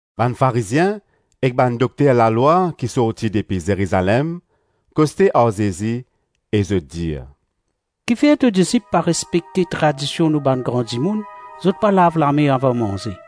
Bann Farizien ek bann dokter lalwa ki sorti depi Zerizalem koste ar Zezi e zot dir, “Kifer to disip pa respekte tradision nou bann gran dimoun? Zot pa lav lame avan manze.”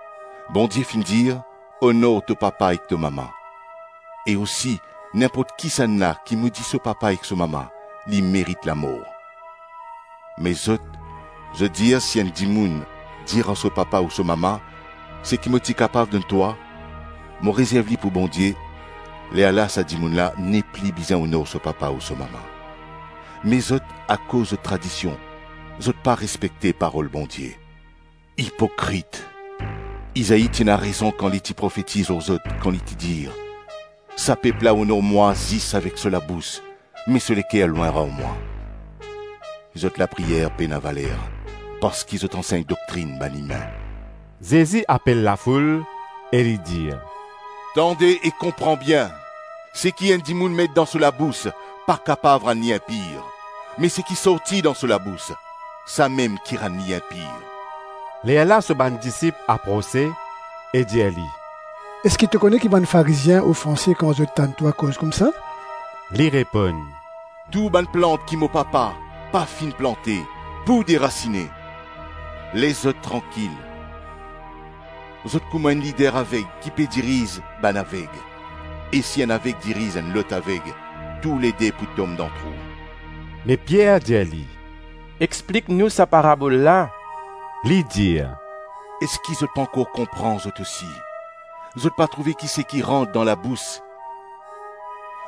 Bondie finn dir, ‘Onor to papa ek to mama; e osi, ninport kisannla ki modi so papa ek so mama, li merit lamor.’ Me zot, zot dir si enn dimoun dir ar so papa ou so mama, ‘Seki mo ti kapav donn twa, mo rezerv li pou Bondie’ lerla sa dimoun la nepli bizin onor so papa ou so mama. Me zot, akoz zot tradision, zot pa respekte parol Bondie. Ipokrit, Izai ti ena rezon kan li ti profetiz lor zot, kan li ti dir, ‘Sa pep la onor mwa zis avek so labous, me so leker lwin ar mwa; Zot lapriyer pena valer, parski zot ansegn doktrinn bann imin.’” Zezi apel lafoul e li dir, “Tande e konpran bien, seki enn dimoun met dan so labous pa kapav rann li inpir, me seki sorti dan so labous, samem ki rann li inpir.” Lerla so bann disip aprose e dir li, “Eski to kone ki bann Farizien ofanse kan zot tann twa koz koumsa?” Li reponn, “Tou bann plant ki mo papa pa finn plante pou derasine. Les zot trankil; zot kouma enn lider aveg ki pe diriz bann aveg. E si enn aveg diriz enn lot aveg, toulede pou tom dan trou.” Me Pier dir li, “Explik nou sa parabol la.” Li dir, “Eski zot pankor konpran zot osi? Zot pa trouve ki seki rant dan labous,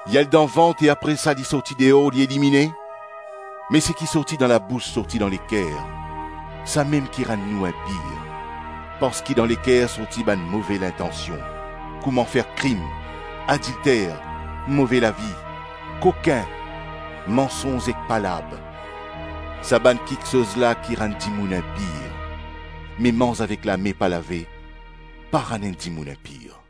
li al dan vant e apre sa li sorti deor, li elimine? Me seki sorti dan labous sorti dan leker, samem ki rann nou inpir. Parski dan leker sorti bann move lintansion, kouma fer krim, adilter, move lavi, kokin, mansonz ek palab. Sa bann kiksoz la ki rann dimoun inpir, me manz avek lame pa lave pa rann enn dimoun inpir.”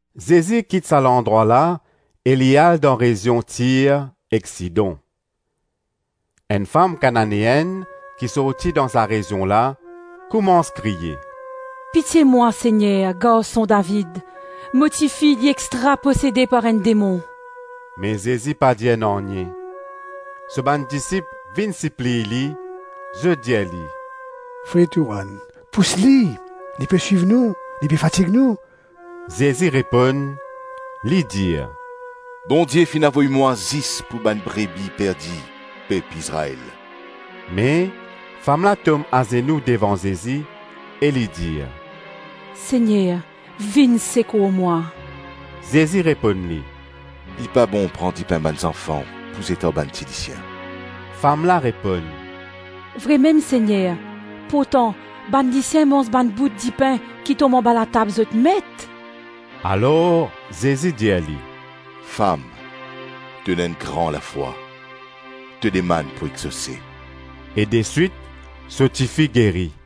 Zezi kit sa landrwa la e li al dan rezion Tir ek Sidon. Enn fam Kananeenn ki sorti dan sa rezion la koumans kriye, “Pitie mwa Segner, Garson David! Mo tifi, li extra posede par enn demon.” Me Zezi pa dir nanye; so bann disip vinn sipliy li, zot dir li, “Pous li, li pe swiv nou, li pe fatig nou.” Zezi reponn, li dir, “Bondie finn avoy mwa zis pou bann brebi perdi pep Izrael.” Me, fam la tom azenou devan Zezi e li dir, “Segner vinn sekour mwa!” Zezi reponn li, “Li pa bon pran dipin bann zanfan pou zet ar bann tilisien.” Fam la reponn, “Vremem, Segner, pourtan bann lisien manz bann bout dipin ki tom anba latab zot met.” Alor Zezi dir li, “Fam, to ena enn gran lafwa; to demann pou exose.” E deswit so tifi geri.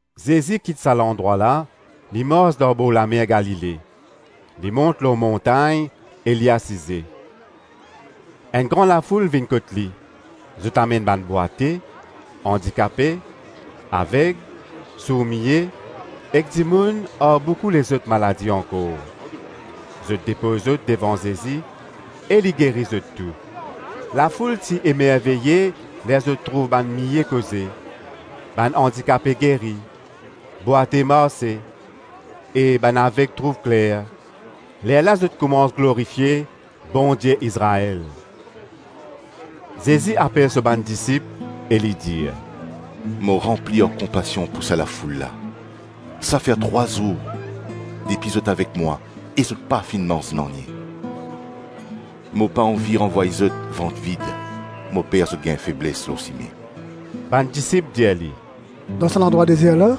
Zezi kit sa landrwa la, li mars dan borlamer Galile, li mont lor montagn e li asize. Enn gran lafoul vinn kot li, zot amenn bann bwate, andikape, aveg, sour-miye ek dimoun ar boukou lezot maladi ankor. Zot depoz zot devan Zezi e li geri zot tou. Lafoul ti emerveye ler zot trouv bann mie koze, bann andikape geri, bwate marse e bann aveg trouv kler; lerla zot koumans glorifie Bondie Izrael. Zezi apel so bann disip e li dir, “Mo ranpli ar konpasion pou sa lafoul la. Sa fer trwa zour depi zot avek mwa e zot pa finn manz nanye. Mo pa anvi ranvway zot vant vid, mo per zot gagn febles lor sime.” Bann disip dir li, “Dan sa landrwa dezer la,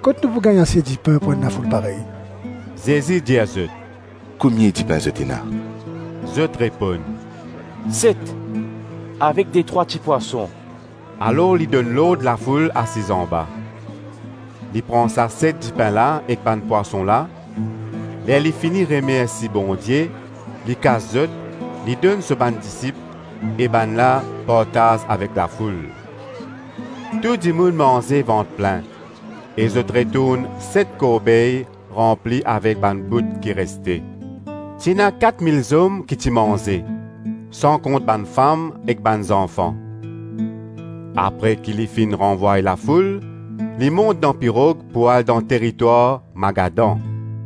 kot nou pou gagn ase dipin pou enn lafoul parey?” Zezi dir zot, “Komie dipin zot ena?” Zot reponn, “Set, avek detrwa tipwason” Alor li donn lord lafoul asiz anba. Li pran sa set dipin la ek bann pwason la, ler li fini remersi Bondie, li kas zot, li donn so bann disip e bann la partaz avek lafoul. Tou dimoun manze vant plin e zot retourn set korbey ranpli avek bann bout ki reste. Ti ena kat mil zom ki ti manze, san kont bann fam ek bann zanfan. Apre ki li finn ranvway lafoul, li mont dan pirog pou al dan teritwar Magadan.